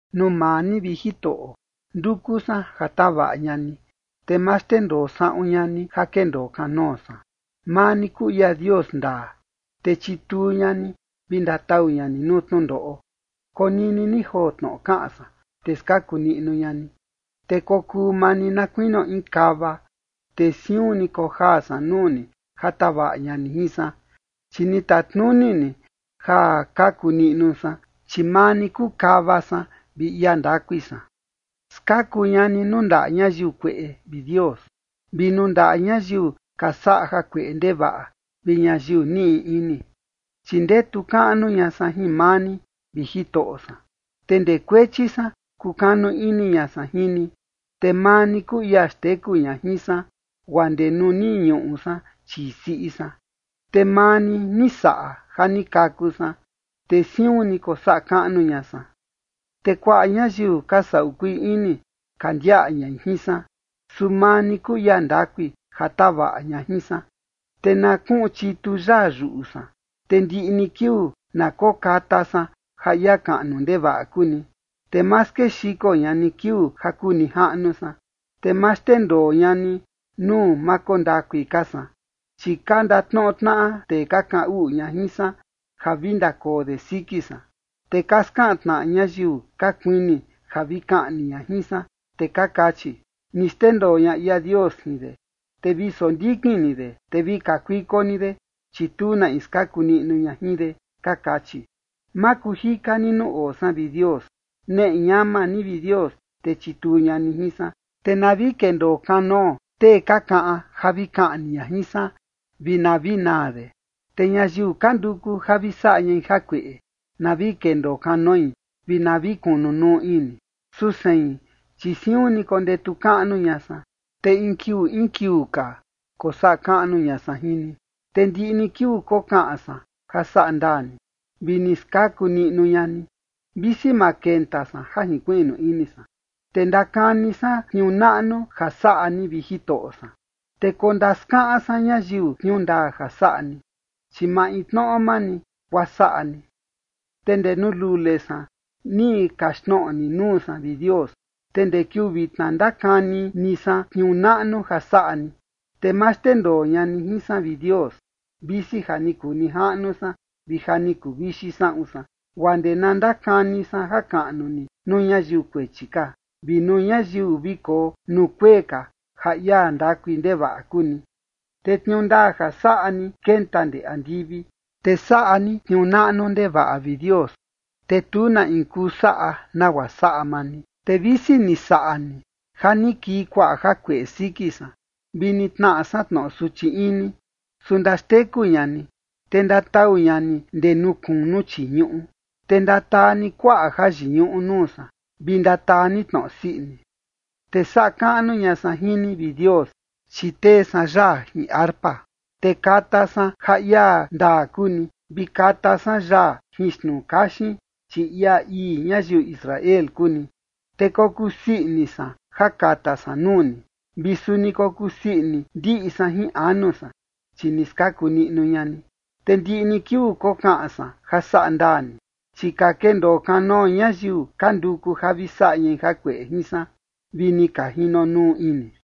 Nuu maa ni, vi Jitoꞌo, nduku san ja tavaꞌa ña ni, te ma xndendoo saꞌun ña ni ja kendoo kanoo san. Maa ni kuu ia Dios ndaa, te chituu ña ni vi ndatau ña ni nuu tnundoꞌo. Konini ni joo tnoꞌo kaꞌan san, te skaku niꞌnu ña ni. Te kokuu maa ni na kuinio in kava, te siun ni kojaa san nuu ni ja tavaꞌa ña ni jin san, chi ni tatnuni ni ja kaku niꞌnu san, chi maa ni kuu kava san vi ia ndakui san. Skaku ña ni nuu ndaꞌa ñayiu kueꞌe, vi Dios, vi nuu ndaꞌa ñayiu ka saꞌa jakueꞌe ndevaꞌa vi ñayiu niꞌi ini. Chi ndetu kaꞌnu ña san jin maa ni, vi Jitoꞌo san, te ndee kuechi san kukanu ini ña san jin ni. Te maa ni kuu ia xteku ña jin san guaa ndee nuu ni ñuꞌu san chii siꞌi san. Te maa ni ni saꞌa ja ni kaku san, te siun ni kosaꞌa kaꞌnu ña san. Te kuaꞌa ñayiu ka saꞌu kuii ini ka ndiaꞌa ñai jin san, su maa ni kuu ia ndakui ja tavaꞌa ña jin san. Te na kuꞌun chitu yaa yuꞌu san, te ndiꞌi ni kiuu na kokata san ja ia kaꞌnu ndevaꞌa kuu ni. Te ma skexiko ña ni kiuu ja kuu nijaꞌnu san, te ma xndendoo ña ni nuu ma koo ndakui ka san. Chi ka ndatnoꞌo tnaꞌa tee ka kaꞌan uꞌu ña jin san ja vi ndakoo de siki san, te ka skaꞌan tnaꞌa ñayiu ka kuini ja vi kaꞌni ña jin san. Te ka kachi: “Ni xndendoo ña ia Dios jin de, te vi sondikin ni de, te vi kakuiko ni de, chi tu na in skaku niꞌnu ña jin de”, ka kachi. Ma kuu jika ni nuu oo san, vi Dios. Neꞌe ñama ni, vi Dios, te chituu ña ni jin san. Te na vi kendoo kanoo tee ka kaꞌan ja vi kaꞌni ña jin san, vi na vi naa de. Te ñayiu ka nduku ja vi saꞌa ñai jakueꞌe, na vi kendoo kanoi, vi na vi kunu nuu ini. Su sein, chi siun ni kondetu kaꞌnu ña san, te in kiuu in kiuu ka, kosaꞌa kaꞌnu ña san jin ni. Te ndiꞌi ni kiuu kokaꞌan san ja saꞌa ndaa ni, vi ni skaku niꞌnu ña ni, visi ma kenta san ja jinkuiꞌnu ini san. Te ndakani san tniuu naꞌnu ja saꞌa ni, vi Jitoꞌo san, te kondaskaꞌan san ñayiu tniuu ndaa ja saꞌa ni, chi maintnoꞌo maa ni guaa saꞌa ni. Te ndee nuu lule san ni kaxtnoꞌo ni nuu san, vi Dios, te ndee kiuu vitna ndakani ni san tniuu naꞌnu ja saꞌa ni. Te ma xndendoo ña ni jin san, vi Dios, visi ja ni kuu nijaꞌnu san vi ja ni kuvixi saꞌun san, guaa ndee na ndakani san jakaꞌnu ni nuu ñayiu kuechi ka, vi nuu ñayiu vi koo nuu kuee ka ja ia ndakui ndevaꞌa kuu ni. Te tniuu ndaa ja saꞌa ni kenta ndee andivi, te saꞌa ni tniuu naꞌnu ndevaꞌa, vi Dios, te tu na in kuu saꞌa nagua saꞌa maa ni. Te visi ni saꞌa ni ja ni kii kuaꞌa jakueꞌe siki san, vi ni tnaꞌa san tnoꞌo suchi ini, su ndaxteku ña ni, te ndatau ña ni ndee nuu kunu chii ñuꞌu. Te ndataa ni kuaꞌa jayiñuꞌu nuu san, vi ndataa ni tnoꞌo sii ini. Te saꞌa kaꞌnu ña san jin ni, vi Dios, chi tee san yaa jin arpa, te kata san ja ia ndaa kuu ni, vi kata san yaa jin xtnuu kaxin, chi ia ii ñayiu Israel kuu ni. Te kokusii ini san ja kata san nuu ni, vi suni kokusii ini ndiꞌi san jin anu san, chi ni skaku niꞌnu ña ni. Te ndiꞌi ni kiuu kokaꞌan san ja saꞌa ndaa ni, chi ka kendoo kanoo ñayiu ka nduku ja vi saꞌa ñai ja kueꞌe jin san, vi ni ka jinonuu ini.